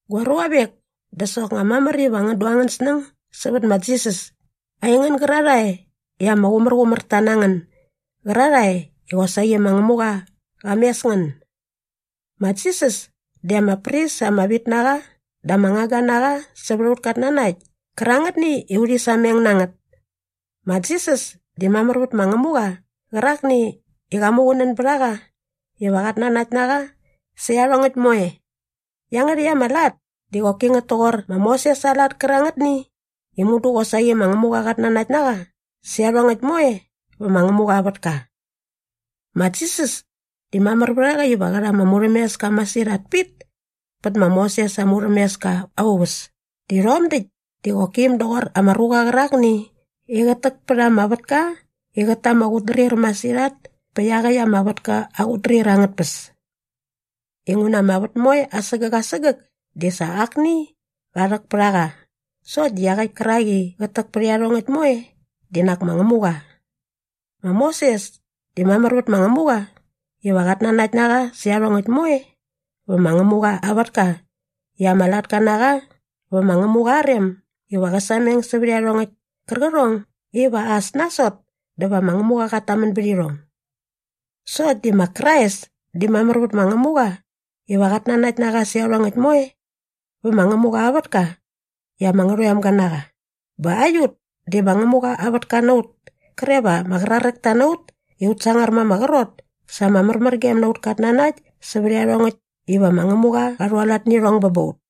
Gua ruavek, dä soknga mamär iva ngän du angän snäng sävät ma Jisas, aingän gärarhae i ama qumärqumärta na ngän gärarhae i qosaqi ma Ngämuqa qa mes ngän. Ma Jisas di ama pris ama vit na qa dä ama ngangga na qa sävät aut katnanakt kärangätni i urhi sameng na ngät. Ma Jisas di mamär vät ma Ngämuqa qärakni i qa muqunän bät a qa iva qat nanakt na qa sä iarhongäkt moe. Iangärhäkt ama lat di qoki ngät toqor ma Moses aa lat kärangätni i mudu qosaqi ma Ngämuqa qat nanakt na qa sä iarhongäkt moe vä ma Ngämuqa aa vätka. Ma Jisas di mamär vät a qa iva qä rha ama murhämeska masirhat pit pät ma Moses aa murhämeska aa uväs di rhom däkt di qoki äm doqor ama ruqa qärakni i qät täk pät ama vätka i qät ta ama qutdrir masirhat pät iaqäkt ama vätka aa qutdrir angät tpäs. Inguna ama vät moe asägäk asägäk di sa akni qa rhäk pät a qa sokt di iaqäkt kärak i qät täk pät iarhongäkt moe di nak ma Ngämuqa. Ma Moses di mamär vät ma Ngämuqa iva qat nanakt na qa sä iarhongäkt moe vä ma Ngämuqa aa vätka i ama latka na qa vä ma Ngämuqa aa rem iva qä sameng sävät iarhongäkt kärqärhong iva as nasot dä va ma Ngämuqa qat tamän bät irhong. Sokt di ma Krais di mamär vät ma Ngämuqa iva qat nanakt na qa sä iarhongäkt moe vä ma Ngämuqa aa vätka i ama ngärhoemga na qa. Bä aiut di ma Ngämuqa aa vätka na ut kre va ama qraräkta na ut i ut sangar ma ama qrot sa ama märmärgem na aut katnanakt sävät iarhongäkt iva ma Ngämuqa qa rhualat nä irhong bä ba ut.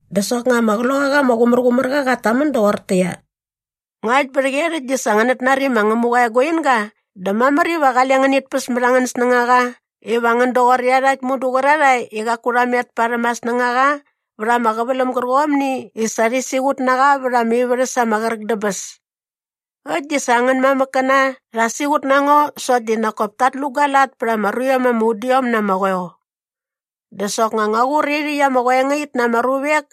Dä soknga ama Qloqaqa ama Qumärqumärqa qat tamän doqortäqyia, “Ngakt bä rhäqyerhäkt di sa ngänät nari ma Ngämuqa aa eguinga dä mamär iva qale ngänit päs mät angän snängaqa iva ngän doqor iarhakt mudu qärarhae i qaku rha met parhäm aa snängaqa vät ama qäväläm gärqomni i sa rhi siqut na qa vät ama ivärhäs ama qräk dä bäs. Äkt di sa angän mamäkkäna rha siqut na ngo sokt di nak kop tat lu gua lat pät ama ruiom ama udiom na ama qoeo. Dä soknga ngua qur irhäkt ama qoengait na ama ruvek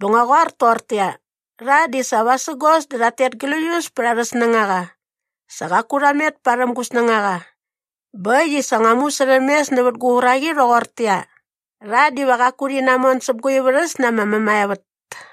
bä ngua qoar toqortäqyia, ‘Rha di sa vasägos dä rhat tet gläius pät arhä snängaqa. Sa qaku rha met parhäm gu snängaqa.’ Bä äkt i sa ngua musärhämes nävät gua uraqi rhoqortäqyia, ‘Rha diva qaku rhi namon säp gua ivärhäs na ama mämaevät.’”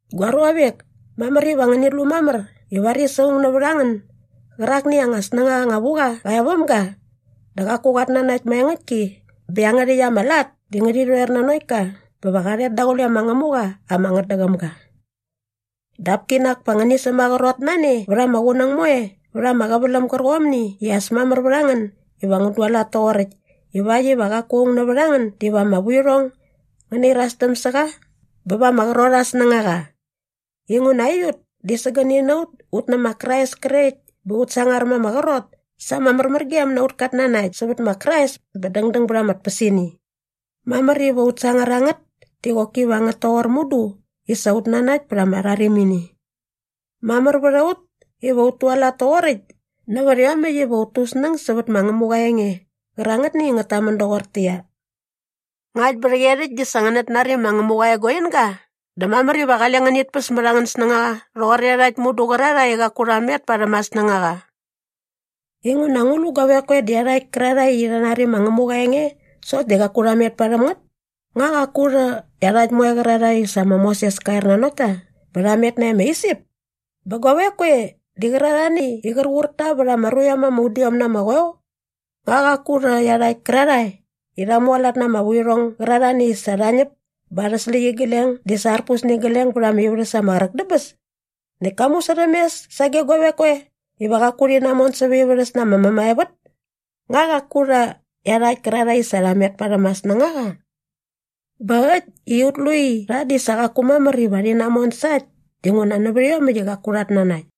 Gua ruavek, mamär iva ngänit lu mamär i varis aung nävät a ngän gärakni i anga snängaqa anga vu qa qa e väm ga dä qaku qat nanakt maengäktki bä iangärhäkt ama lat di ngärhi rhoer nanokt ka bä va qa rhet daqule ma Ngämuqa ama ngätdäqäm ga. Dap kinak pa ngänit sämaqrot na ne vät ama qunäng moe vät ama qäväläm gärqomni i as mamär vät a ngän iva ngän dualat toqoräkt ivakt iva qaku aung nävät a ngän diva ama vuirhong ngärhi irastäm sä qa bä va ama qrot aa snängaqa. Inguna aiut di sägäni na ut ut nä ma Krais krekt bä ut sangar ma ama qrot sa ama märmärgem na aut katnanakt sävät ma Krais bä dängdäng bät ama tpäsini. Mamär iva ut sangar a ngät di qoki va ngät toqor mudu i sa ut nanakt pät ama rharimini. Mamär vät a ut iva ut tualat toqoräkt nävät iomäkt iva ut tu ut snäng sävät ma Ngämuqa aa enge qärangätni i ngät tamän doqortäqyia, “Ngakt bä rhäqyerhäkt di sa ngänät nari ma Ngämuqa aa eguinga dä mamär iva qale ngänit päs mät angän snängaqa rhoqor iarhakt mudu qärarhae i qaku rha met parhäm aa snängaqa.” Inguna guavek koe di iarhakt kärarhae i sa rha nari ma Ngämuqa aa enge sokt di qaku rha met parhäm ngät? Nga qaku rhä iarhakt moe qärarhae i sa ma Moses ka er nanokt ta bä rha met nae ma Isip? Bä guavek koe di qärarhani i qär qur ta vät ama ruiom ama udiom na ama qoeo? Nga qaku rhä iarhakt kärarhae i rha mualat na ama vuirhong gärarhani i sa rha ñäp bä arhä släqyigleng di sa arpus nä igleng bät ama ivärhäs ama qräk dä bäs? Näkt ka musärhämes sage guavek koe iva qaku rhi namon säva aa ivärhäs na ama mämaevät? Nga qaku rhä iarhakt kärarhae i sa qaku rha met parhäm aa snängaqa? Bä äkt i ut lu i rha di sa qaku mamär iva rhi namon sa äkt dinguna nävät iomäkt i qaku rhat nanakt.